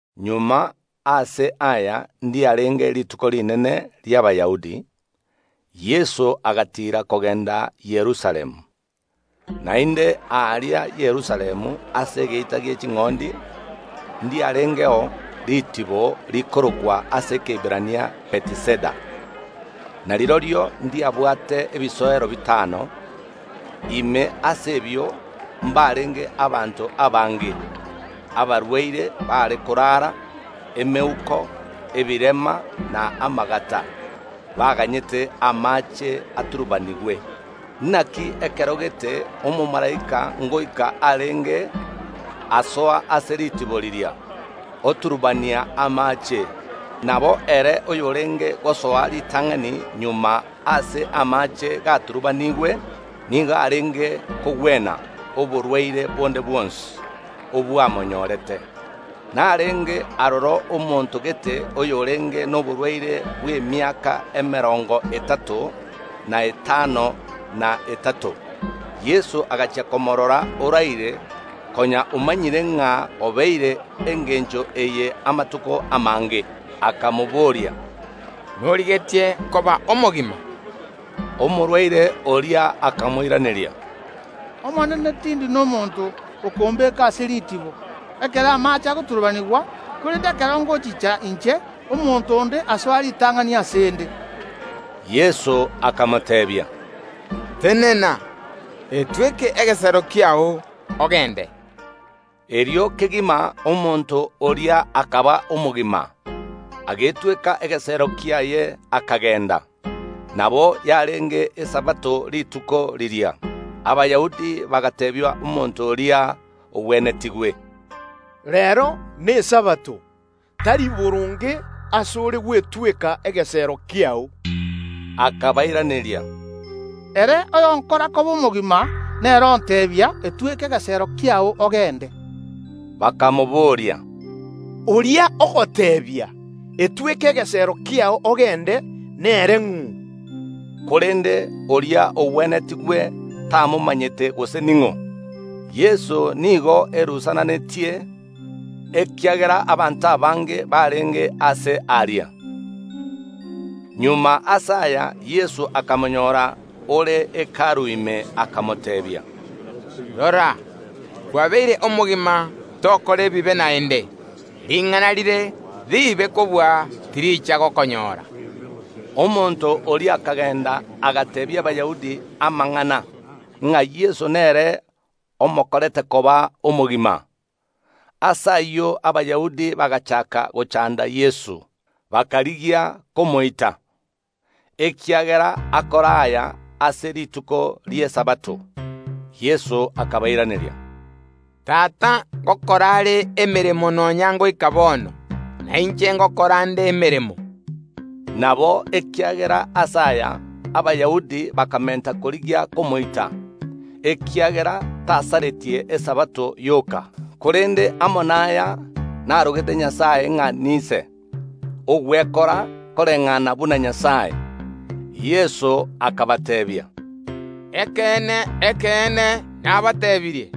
Magega ase aya ndiarenge Rituko Rinene ri’Abayahudi; Yeso agatiira kogenda Yerusalemu. Naende aaria Yerusalemu ase Egeita gie Ching’ondi ndiarengeo ritibo rikorokwa ase Ekeiberania Betiseda, na rirorio ndiabwate ebisoero bitano. Ime ase ebio mbarenge abanto abange abarwaire baare koraara, emeuko, ebirema, na amagata, [baganyete amaache aturubanigwe. Naki ekero gete omomalaika ngoika arenge osoa ase ritibo riria, oturubania amaache. Nabo ere oyorenge gosoa ritang’ani magega ase amaache gaturubaniigwe, nigo arenge kogwena oborwaire bonde bwonsi obwamonyorete.] Narenge aroro omonto gete oyorenge noborwaire bw’emiaka emerongo etato, na etano na etato. Yeso agachia komorora oraire, konya omanyire ng’a obeire engencho eye amatuko amange, akamobooria, “Norigetie koba omogima?” Omorwaire oria akamoiraneria, “Omonene, tindi nomonto okombeka ase ritibo, ekero amaache agoturubanigwa; korende ekero ngochicha inche, omonto onde asoa ritang’ani ase ’nde.” Yeso akamoteebia, “Tenena, etweke egesero kiao, ogende.” Erio kegima omonto oria akaba omogima, agetweka egesero kiaye, akagenda. Nabo yarenge Esabato rituko riria. Abayahudi bagateebia omonto oria ogwenetigwe, “Reero n’Esabato, tari boronge ase ore gwetweka egesero kiao.” Akabairaneria, “Ere oyonkora koba omogima nere onteebia: Etweke egesero kiao, ogende.” Bakamobooria, “Oria ogoteebia: Etweke egesero kiao ogende, nere ng’o?” Korende oria ogwenetigwe tamomanyete gose ning’o. Yeso nigo erusananetie, ekiagera abanto abange barenge aase aria. Magega ase aya Yeso akamonyora ore Hekalu ime, akamoteebia. “Rora, kwabeire omogima; tokora ebibe naende, ring’ana rire riibe kobua tiricha gokonyoora.” Omonto oria akagenda, agateebia Abayahudi amang’ana, ng’a Yeso nere omokorete koba omogima. Ase ayio Abayahudi bagachaaka gochanda Yeso, bakarigia komoita, ekiagera akora aya ase rituko ri’Esabato. Yeso akabairaneria, “Tata ngokora are emeremo nonya ngoika bono, na inche ngokora nde emeremo.” Nabo ekiagera ase aya Abayahudi bakamenta korigia komoita, ekiagera tasaretie Esabato yoka, korende amo naya narogete Nyasae ng’a n’Ise, ogwekora koreng’ana buna Nyasae. Yeso akabateebia, “Ekeene, ekeene, nabateebirie: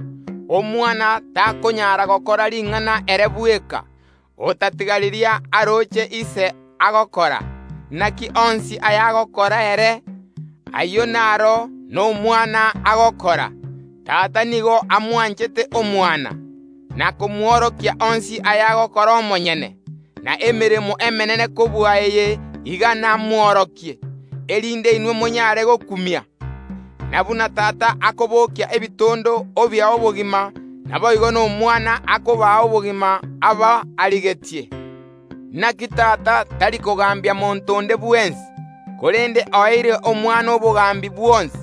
Omwana takonyara gokora ring’ana ere bweka, otatiga riria aroche Ise agokora; naki onsi aya agokora ere, ayio naro n’Omwana agokora. Tata nigo amwanchete Omwana, na komworokia onsi ayagokora omonyene; na emeremo emenene kobua eye iga namworokie, erinde inwe monyaare gokumia. Na buna Tata akobokia ebitondo obia obogima, naboigo n’Omwana akobaa obogima aba arigetie. Naki Tata tari kogambia monto onde bwensi, korende oeire Omwana obogambi bwonsi,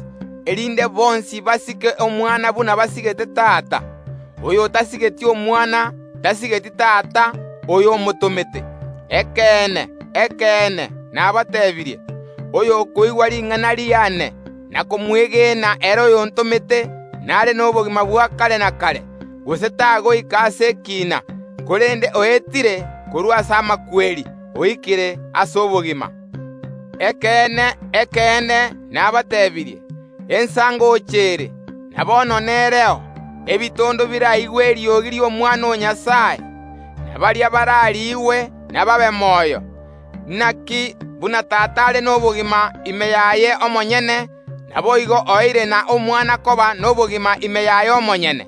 erinde bonsi basike Omwana buna basigete Tata. Oyotasigeti Omwana tasigeti Tata oyo omotomete. Ekeene, ekeene, nabateebirie: Oyokoigwa ring’ana riane, na komwegena ere oyontomete nare nobogima bwa kare na kare, gose tagoika ase ekiina, korende oetire korwa ase amakweri, oikire ase obogima. “Ekeene, ekeene, nabateebirie: Ensa ngocha ere, na bono nereo, ebitondo biraigwe eriogi ri’Omwana o Nyasae, na baria barariigwe nababe moyo. Naki buna Tata are nobogima ime yaye omonyene; naboigo oeire na Omwana koba nobogima ime yaye omonyene.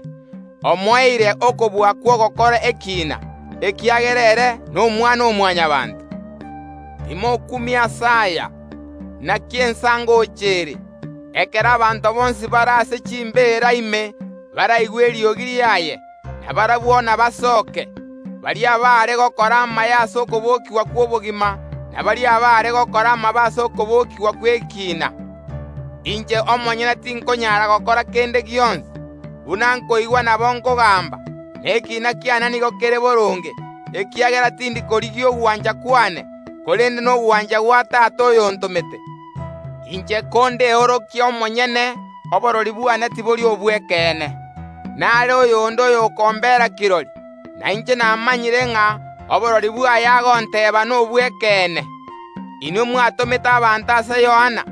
Omoeire okobua kw’ogokora ekiina, ekiagera ere n’Omwana‐o‐Mwanyabaanto. Timokumia ase aya! Naki ensa ngocha ere, ekero abanto bonsi bare ase chimbeera ime baraigwe eriogi riaye, na barabwo inabasoke, baria abaare gokora amaya ase okobokigwa kw’obogima, na baria abaare gokora amabe ase okobokigwa gw’ekiina. “Inche omonyene tinkonyaara gokora kende gionsi. Buna nkoigwa nabo nkogamba, na ekiina kiane nigo kere boronge, ekiagera tindi korigia ogwancha kwane, korende nogwancha gwa Tata oyontomete. Inche kondeorokie omonyene, oborori bwane tibori obw’ekeene. Nare oyonde oy’okombera kirori; na inche namanyire ng’a oborori bwaye agonteeba nobw’ekeene. Inwe mwatomete abanto ase Yohana,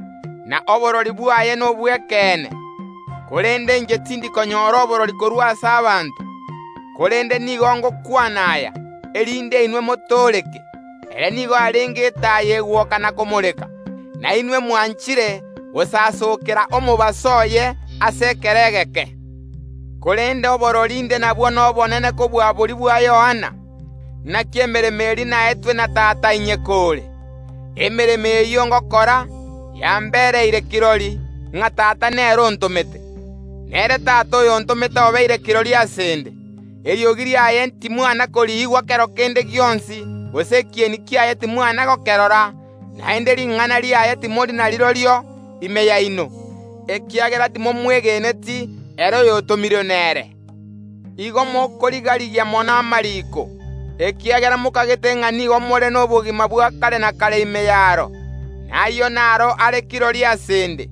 na oborori bwaye nobw’ekeene. Korende inche tindi konyora oborori korwa ase abanto; korende nigo ngokwana aya, erinde inwe motooreke. Ere nigo arenge etaaya egwoka na komoreka, na inwe mwanchire gosasokera omobaso oye ase ekero egeke. Korende oborori inde nabwo nobonene kobua boria bwa Yohana, naki emeremo eria naetwe na Tata inyekoore. Emeremo eyio ngokora, yambereire kirori, ng’a Tata nere ontomete. Nere Tata oyontomete obeire kirori ase ’nde. Eriogi riaye timwana koriigwa kero kende gionsi, gose ekieni kiaye timwana gokerora naende ring’ana riaye timori narirorio ime yaino, ekiagera timomwegeneti ere oyotomirwe nere. Igo mokorigarigia mono amariiko, ekiagera mokagete ng’a nigo more nobogima bwa kare na kare ime y’aro; na ayio naro are kirori ase ’nde,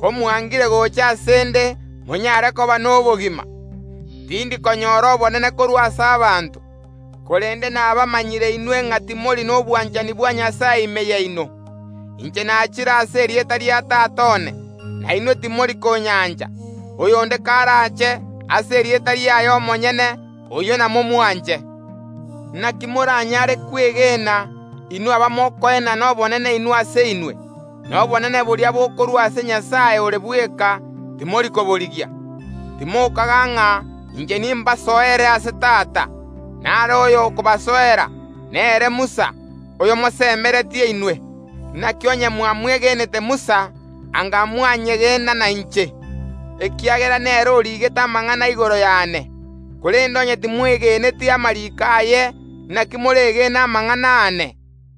ko mwangire gocha ase ’nde monyare koba nobogima. Tindi konyora obonene korwa ase abanto. Korende nabamanyire inwe ng’a timori nobwanchani bwa Nyasae ime yaino. Inche nachire ase erieta ria Tata one, na inwe timori konyancha; oyonde karaache ase erieta riaye omonyene, oyio namomwanche. Naki moranyare kwegena, inwe abamokoenana obonene inwe ase inwe, na obonene boria bokorwa ase Nyasae ore bweka, timori koborigia? Timokaga ng’a inche nimbasoere ase Tata; nare oyo okobasoera, nere Musa, oyomosemeretie inwe. Naki onye mwamwegenete Musa anga mwanyegena nainche, ekiagera nere origete amang’ana igoro yane. Korende onye timwegeneti amariiko aye, naki moregene amang’ana aane?”